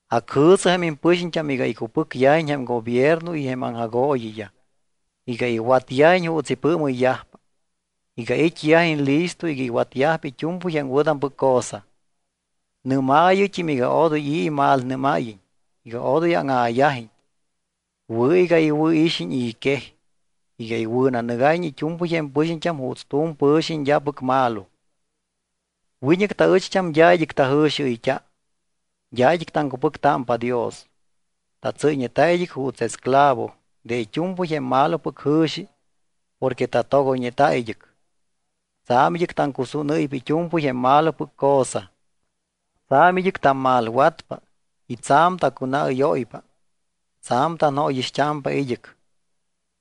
Acjɨ̱sɨ jém impɨxiñt́am iga icupɨcyajiñ jém gobierno y jém aŋjagooyiyaj, iga iwatyajiñ juuts ipɨɨmɨyyajpa, iga it́yajiñ listo iga iwatyajpa it́u̱mpɨy jém wɨ̱tampɨc cosa. Nɨ́maayɨt́im iga odoy i̱ imalnɨ́máyiñ, iga odoy áŋa̱yajiñ. Wɨ̱ iga iwɨ̱ixiñ i̱ quej, iga iwɨ̱nanɨgáyiñ it́u̱mpɨy jém pɨxiñt́am juuts tu̱m pɨ̱xiñ d́apɨc malo. Wiñɨc taɨcht́am d́a id́ɨc tajɨ̱xiɨyt́a. D́a id́ɨc taŋcupɨctámpa Dios. Tatsɨ́yñeta id́ɨc juuts esclavo de it́u̱mpɨy jém malopɨc jɨ̱xi porque tatogoyñeta id́ɨc. Tsa̱m id́ɨc taŋcusúnɨ́ypa it́u̱mpɨy jém malopɨc cosa. Tsa̱m id́ɨc tammalwatpa y tsa̱m tacunaɨ́yóypa. Tsa̱m tanajóyixt́amta̱p id́ɨc.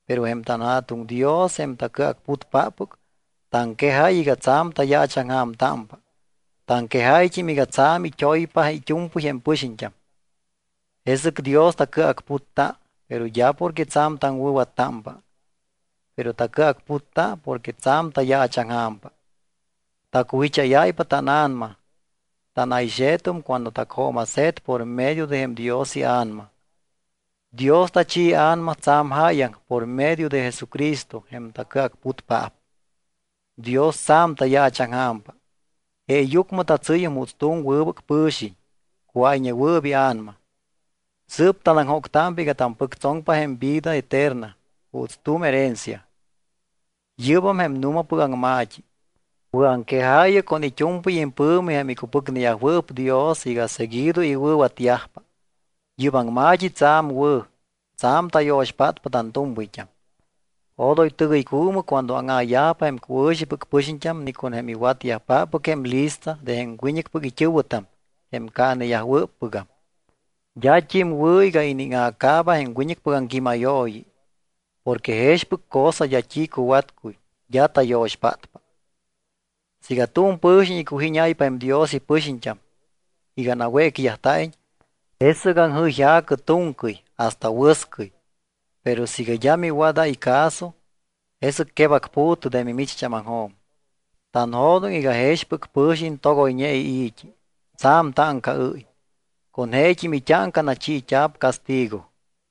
Pero jém tanJa̱tuŋ Dios, jém tacɨacputpáppɨc, taŋquejáy iga tsa̱m tayaachaŋja̱mtámpa. Taŋquejáyt́im iga tsa̱m it́oypa it́u̱mpɨy jém pɨxiñt́am. Jesɨc Dios tacɨacputta, pero d́a porque tsa̱m taŋwɨ̱wattámpa, pero tacɨacputta porque tsa̱m tayaachaŋja̱mpa. Tacujicháyáypa tána̱nama, tana̱yxe̱tum cuando tacjooma̱se̱t por medio de jém Dios iA̱nama. Dios tachi iA̱nama tsa̱m jáyaŋ por medio de Jesucristo jém tacɨacputpaap. Dios tsa̱m tayaachaŋja̱mpa, jeeyucmɨ tatsɨ́yum juuts tu̱m wɨbɨc pɨ̱xiñ, cuáyñewɨɨp ia̱nama. Sɨɨp tanaŋjóctámpa iga tampɨctsoŋpa jém vida eterna juuts tu̱m herencia. Yɨ́bam jém nu̱mapɨc aŋma̱t́i. Wɨ̱aŋquejaayɨ con it́u̱mpɨy impɨ̱mi jém icupɨcneyajwɨɨp Dios iga seguido iwɨ̱watyajpa. Yɨ́p aŋma̱t́i tsa̱m wɨ̱, tsa̱m tayo̱xpátpa tantu̱mpɨyt́am. Odoy tɨgɨycuumɨ cuando áŋa̱yajpa jém cuɨ̱xipɨc pɨxiñt́am ni con jém iwatyajpáppɨc jém lista de jém wiñɨcpɨc it́ɨ̱wɨtam, jém caaneyajwɨ́ppɨgam. D́at́im wɨ̱ iga iníŋa̱caaba jém wiñɨcpɨc aŋquímayooyi. Porque jexpɨc cosa d́a t́i cuwatcuy, d́a tayo̱xpátpa. Siiga tu̱m pɨ̱xiñ icujíñáypa jém Dios ipɨxiñt́am iga nawécyajta̱iñ, jesɨc aŋjɨyja̱cɨ tu̱ŋcɨy hasta wɨscɨy. Pero siiga d́a miwadáy caso, jesɨc quebacpu̱tɨ de mimicht́ámaŋjo̱m. Tanjo̱doŋ iga jexpɨc pɨ̱xiñ togoyñe ii̱t́i, tsa̱m táŋcaɨ́y. Con jeet́im it́áŋca nachiit́a̱p castigo.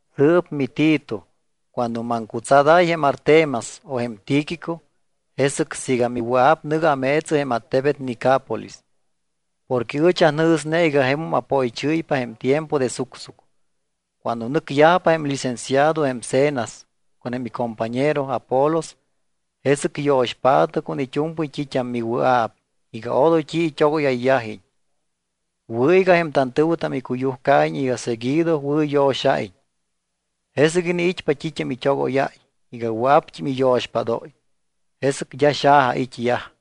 Sɨɨp miTito, cuando maŋcutsadáy jém Artemas o jém Tíquico, jesɨc siiga miwɨa̱p, nɨ̱gɨ ameetsɨ jém attebet Nicápolis. Porque ɨch anjɨ̱sne iga jemum apoychɨ́ypa jém tiempo de sucsuc. Cuando nɨcyajpa jém licenciado jém Zenas, con jém icompañero, Apolos, jesɨc yo̱xpaatɨ con it́u̱mpɨy t́it́am miwɨa̱p iga odoy t́i it́ógóyayyajiñ. Wɨ̱ iga jém tantɨ̱wɨtam icuyujcaiñ iga seguido wɨ̱yo̱xa̱iñ, jesɨc iniit́pa t́it́am it́ogóyáy iga wɨa̱pt́im iyo̱xpádóy. Jesɨc d́a xaja it́yaj.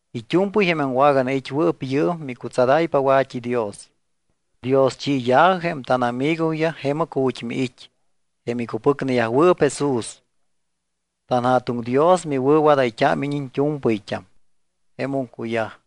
It́u̱mpɨy jém aŋwaganait́wɨɨp yɨɨm micutsadáypa wa̱t́idios. Dioschiya̱jɨ jém tánamigoyaj jemɨc ju̱t́ miit́, jém icupɨcneyajwɨɨp Jesús. TanJa̱tuŋ Dios miwɨ̱wadayt́ámiñ iñt́u̱mpɨyt́am. Jemum cuyaj.